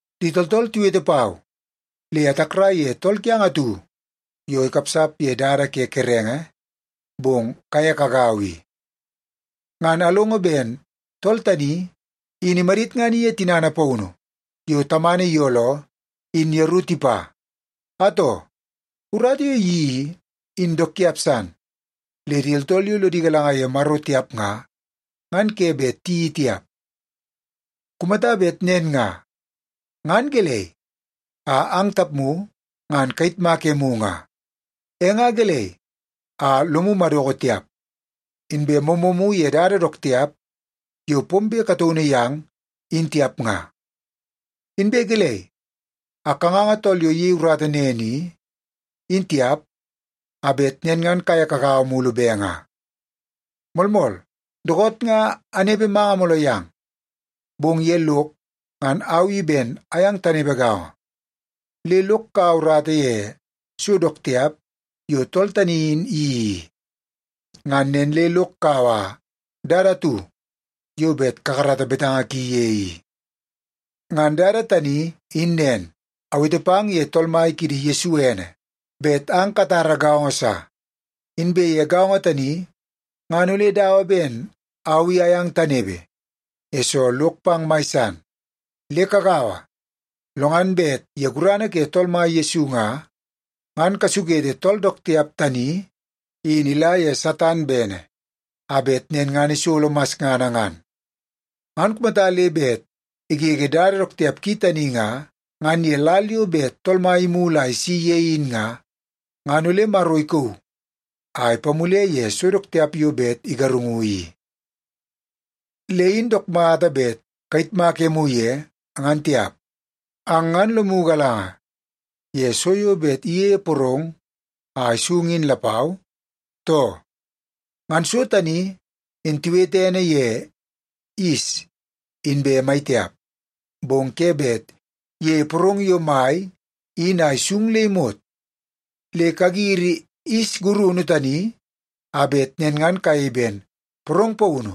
Di tooltool tiwete pau le atakrai ye tool kiang atu yo ikapsap ye dada ke kerenge, bong kaye kagaua i. Ngan alongo ben tool tani in imadit ngan iye tinana paunu yo tamana iyooloo in yeru tipa. Atoo, urata yo iyeii i, in dook tiap san le di tooltool yo lodi galanga ye Maro tiap nga, ngan ke bet di tiyeii tiap. Kumata bet nen nga, ngan gelei a ang tapmu ngan kayitmak emu nga? E nga gelei a lomu madoko tiap, inbe moomoomu ye dada dook tiap yo pombe kataunu yang in tiap nga? Inbe gelei a kanganga tool yo iyei urata nen i, in tiap, a bet nen ngan kaye kagaua mulu be nga? Moolmool, dookoot nga anepe manga mooloo yang, bong ye lok ngan au i ben ayang tanepe gaongo. Le lok kaua urata ye so dook tiap yo tool tani in iyeii i. Ngan nen le lok kaua dada atu yo bet kakarata betanga ki ye i. Ngan dada tani in nen, awete pang ye Tool Mai kiidi Yesu ene bet ang katara gaongo sa. Inbe ye gaongo tani ngan ole dawa ben au i ayang tanepe, yesoo lok pang mai san. Le kagaua, lo ngan bet ye gurana ke Tool Mai Yesu nga, ngan kasukete tool dook tiap tani in ila ye Satan bene, a bet nen ngan isolo masngana ngan. Ngan kumata le bet igege dada dook tiap ki tani nga, ngan ye lal yo bet Tool Mai imulu a isi ye in nga, ngan ole Maro ikauu a ipamule ye so dook tiap yo bet igarungu i. Le in dook mata bet kayitmak emu ye, ngan tiap. Ang ngan lomu galanga ye so yo bet iyeie porong a isung in lapau, too? Ngan so tani in tiwete ene ye yis inbe mai tiap, bong ke bet iyeie porong yo mai in a isung le imot. Le kagiri yis gurunu tani a bet nen ngan kayei ben porong paunu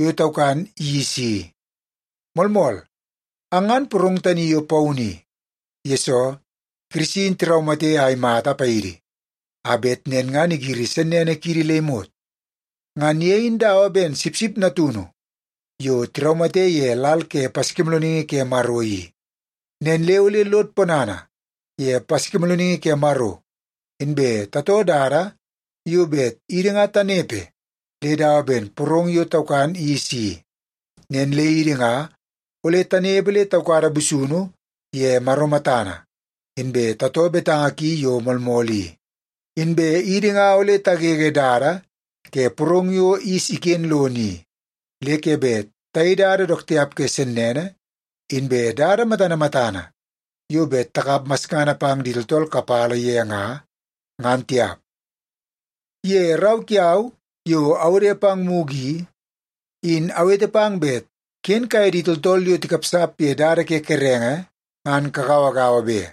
yo taukan yis i. Moolmool, ang ngan porong tani yo paunu i, yesoo Kirisi in tiraumate a imata paidi a bet nen ngan igiri sennene kiidi le imot. Ngan ye in dawa ben sipsip natunu yo tiraumate ye lal ke Paskimoolooningi ke Maro i. Nen le ole lod ponana ye Paskimoolooningi ke Maro, inbe tatoo dada yo bet idi nga tanepe le dawa ben porong yo taukan yis i. Nen le idi nga ole tanepe le taukada busunu ye Maro matana, inbe tatoo betanga ki yo moolmool i. Inbe idi nga ole tagege dada ke porong yo yis iken lono i. Le ke bet tayei dada dook tiap ke sennene, inbe dada matana matana yo bet takap masngana pang di tooltool kapala ye nga, ngan tiap. Ye rau kiau yo awode pang mugu i, in awete pang bet ken kaye di tooltool yo tikapsap ye dada ke kerenge ngan kagauagaua be.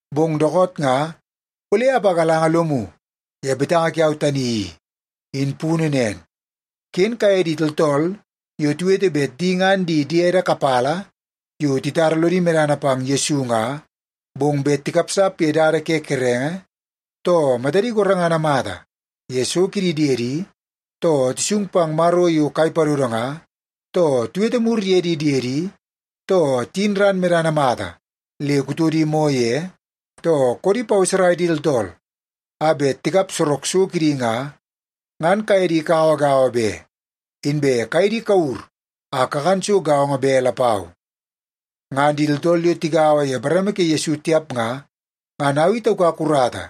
Bong dookoot nga ole apagalanga lomu ye betanga kiau tani i, in punu nen. Ken kaye di tooltool yo tiwete bet di ngan di diede kapala yo titara lodi medana pang Yesu nga, bong bet tikapsap ye dada ke kerenge, too matadi gorengana mata ye so kidi diedi, too tisung pang maro yo kai padodo nga, too tiwete mur ye di diedi, too tiyin ran medana mata le kutodi moo ye, too koodi paweserai di tooltool a bet tikap sorok so kidi nga, ngan kaye di kagauagaua be. Inbe kaye di kawur a kakan so gaongo be lapau. Ngan di tooltool yo tigaua ye bareme ke Yesu tiap nga, ngan au i taukak urata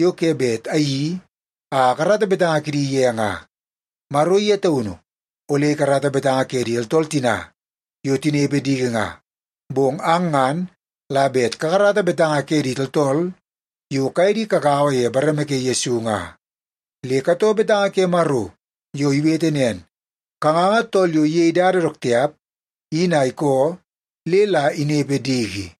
yo ke bet ayeii a akarata betanga kidi ye nga. Maro ye taunu ole ikarata betanga ke di tooltool tina yo tinepe diki nga. Bong ang ngan la bet kakarata betanga ke di tooltool yo kaye di kagaua ye bareme ke Yesu nga. Le katoo betanga ke Maro yo iwete nen, “Kanganga tool yo iyei dada dook tiap in a ikoo le la inepe diki.”